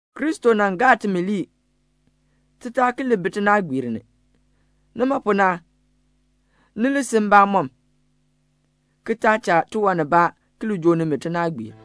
Kristo nan gaa timi lii, ti taa ki li bi tinaagbiir ni. Nima pu na, ni li si mbamɔm, ki taa cha tiwan nibaa ki li joo nimi tinaagbiir.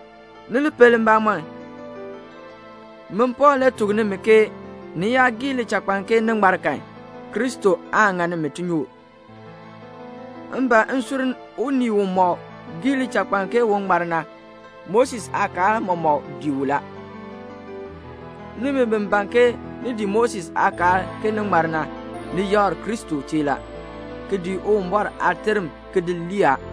Ni li pel mbamɔm, min Pɔɔl le tuk nimi ke ni yaa gii lichakpaln ke ni ŋmar kan, Kristo aan ŋa nimi tinyoor. M ban m ki sur unii umɔk gii uchakpaln ke un ŋmar na, Moses aakaal mɔmɔk dii u la. Nimi bi ban ke ni dii Moses aakaal ke ni ŋmar na, ni yakr Kristo chee la, ki di Uwumbɔr aaterm ki di lii a.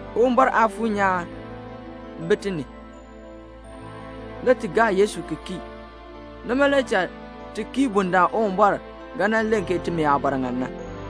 Uwumbɔr Aafuur nyaan bi ti ni. Le ti gaa Yesu ki kii. Nima le cha ti kii bundaln Uwumbɔr ga nan len ke timi aabɔr ŋan na.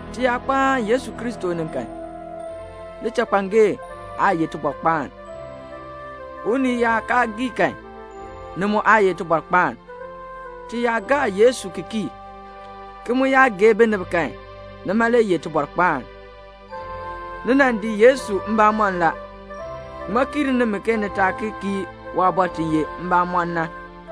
Ti yaa kpaan Yesu Kristo ni kan, lichakpangee aa ye tibɔrkpaan. Unii yaa kaa gii kan, ni mu aa ye tibɔrkpaan. Ti yaa gaa Yesu ki kii, ki mu yaa gee binib kan, nima le ye tibɔrkpaan. Ni nan dii Yesu mbamɔm la. Ŋmaa kiir nimi ke ni taa ki kii waabɔr ti ye mbamɔn na?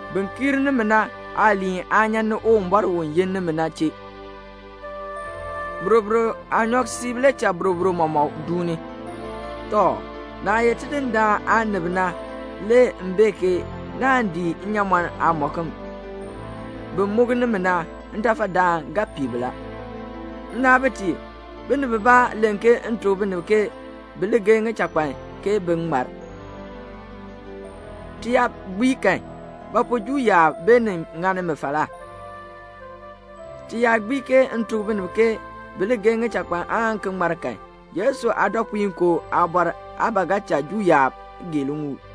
Bin kiir nimi na aaliin aa nyan ni Uwumbɔr u yin nimi na chee. Boroboro aanyɔk siib le cha boroboro mɔmɔk duuni. Tɔ, naah ye Tidindaan aanib na le m bee ke naan dii nnyaamɔn aamɔkm. Bin muk nimi na, ntafadaan ga pii bi la. Nnaabitiib, binib bibaa len ke m tuk binib ke bi li geei ŋichakpan ke bin ŋmar. Ti yaa gbii kan, ba pu Juu yaab beenin ŋani mi falaa? Ti yaa gbii ke m tuk binib ke bi li geei ŋichakpan aan ki ŋmar kan, Yesu aadɔpuinkoo aabɔr aa ba ga cha Juu yaab gee liŋuul.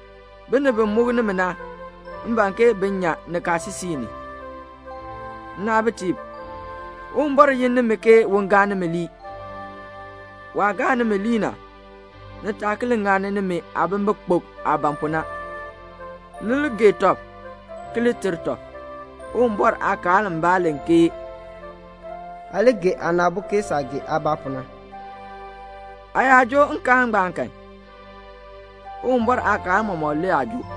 Binib bi muk nimi na, m ban ke bin nyan nikaasisik ni. Nnaabitiib, Uwumbɔr yin nimi ke un gaa nimi lii. Waah gaa nimi lii na, ni taa ki li ŋani nimi aabimbikpok aah ban pu na. Ni li gee tɔb ki li ter tɔb. Uwumbɔr aakaal mbaa len ke "Aa li gee aana aabo ke saah gee aabaa pu na." Aa yaa joo nkaal ngbaan kan, Uwumbɔr aakaal mɔmɔk le aa joo.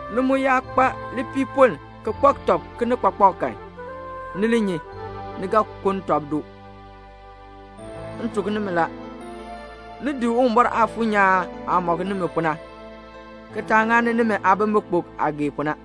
Ni mu yaa kpa lipiipoln ki kpak tɔb kinikpakpak kan, ni li nyi, ni ga kuln tɔb doo. M tuk nimi la, diin Uwumbɔr Aafuur nyaan aah mɔk nimi pu na man, ki taa ŋani nimi aabimbikpok aah gee pu na.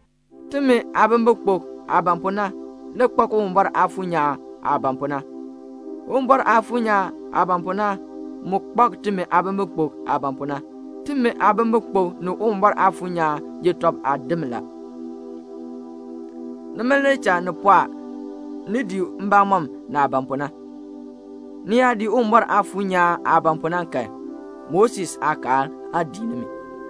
Timi aabimbikpok aah ban pu na le kpak Uwumbɔr Aafuur nyaan aah ban pu na. Uwumbɔr Aafuur nyaan aah ban pu na mu kpak timi aabimbikpok aah ban pu na. Timi aabimbikpok ni Uwumbɔr Aafuur nyaan ye tɔb aadim la. Nima le cha ni pɔɔ ni dii mbamɔm naah ban pu na. Ni yaa dii Uwumbɔr Aafuur nyaan aah ban pu na kan, Moses aakaal aa dii nimi.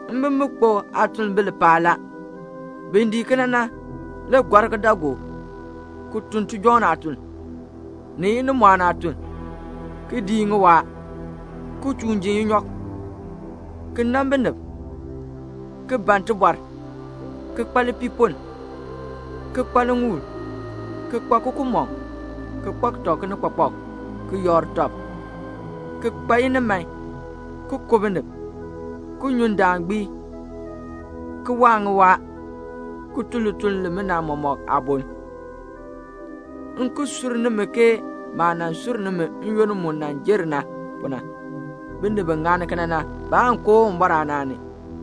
Mbimbikpok aatuln bi lipaal la. Bin dii kena na le gɔr kidaagook, ki tun tijɔŋ aatuln, ni inimɔɔn aatuln, ki dii ŋiwaa, ki chuun ji inyɔk, ki nan binib, ki ban tibɔr, ki kpa lipiipoln, ki kpa liŋuul, ki kpa kukumɔŋ, ki kpak tɔb kinikpakpak, ki yakr tɔb, ki kpa iniman, ki ku binib, ki nyu ndaan gbii, ki waa ŋiwaa, ki tun lituln limina mɔk aaboln. M ki sur nimi ke maah nan sur nimi n-yoonn mu jer na pu na, binib bi ŋani kena na, baan koo Uwumbɔr aanaan ni.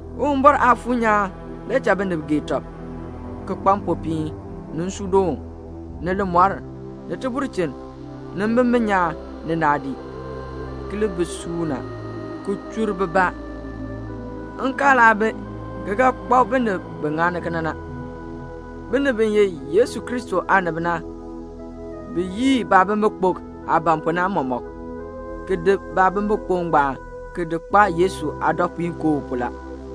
Uwumbɔr Aafuur nyaan le cha binib gee tɔb, ki kpa mpopiin, ni nsuudoon, ni limɔr, ni tibulchin, ni mbimbin nyaan, ni naadii, ki li bi suuna, ki chur bibaa. Nkaal aa bi ki ga kpak binib bi ŋani kena na. Binib bi ye Yesu Kristo aanib na, bi yii baabimbikpok aah ban pu na mɔmɔk, ki di mbimbikpok ngbaan ki di kpaa Yesu aadɔpuinkoo pu la.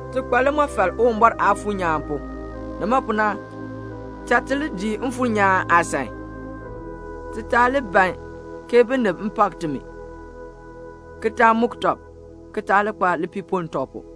Ti kpa limɔfal Uwumbɔr Aafuur nyaan pu. Nima pu na, cha ti li dii Mfuur nyaan aasan. Ti taa li ban ke binib pak timi, ki taa muk tɔb, ki taa li kpa lipiipoln tɔb pu.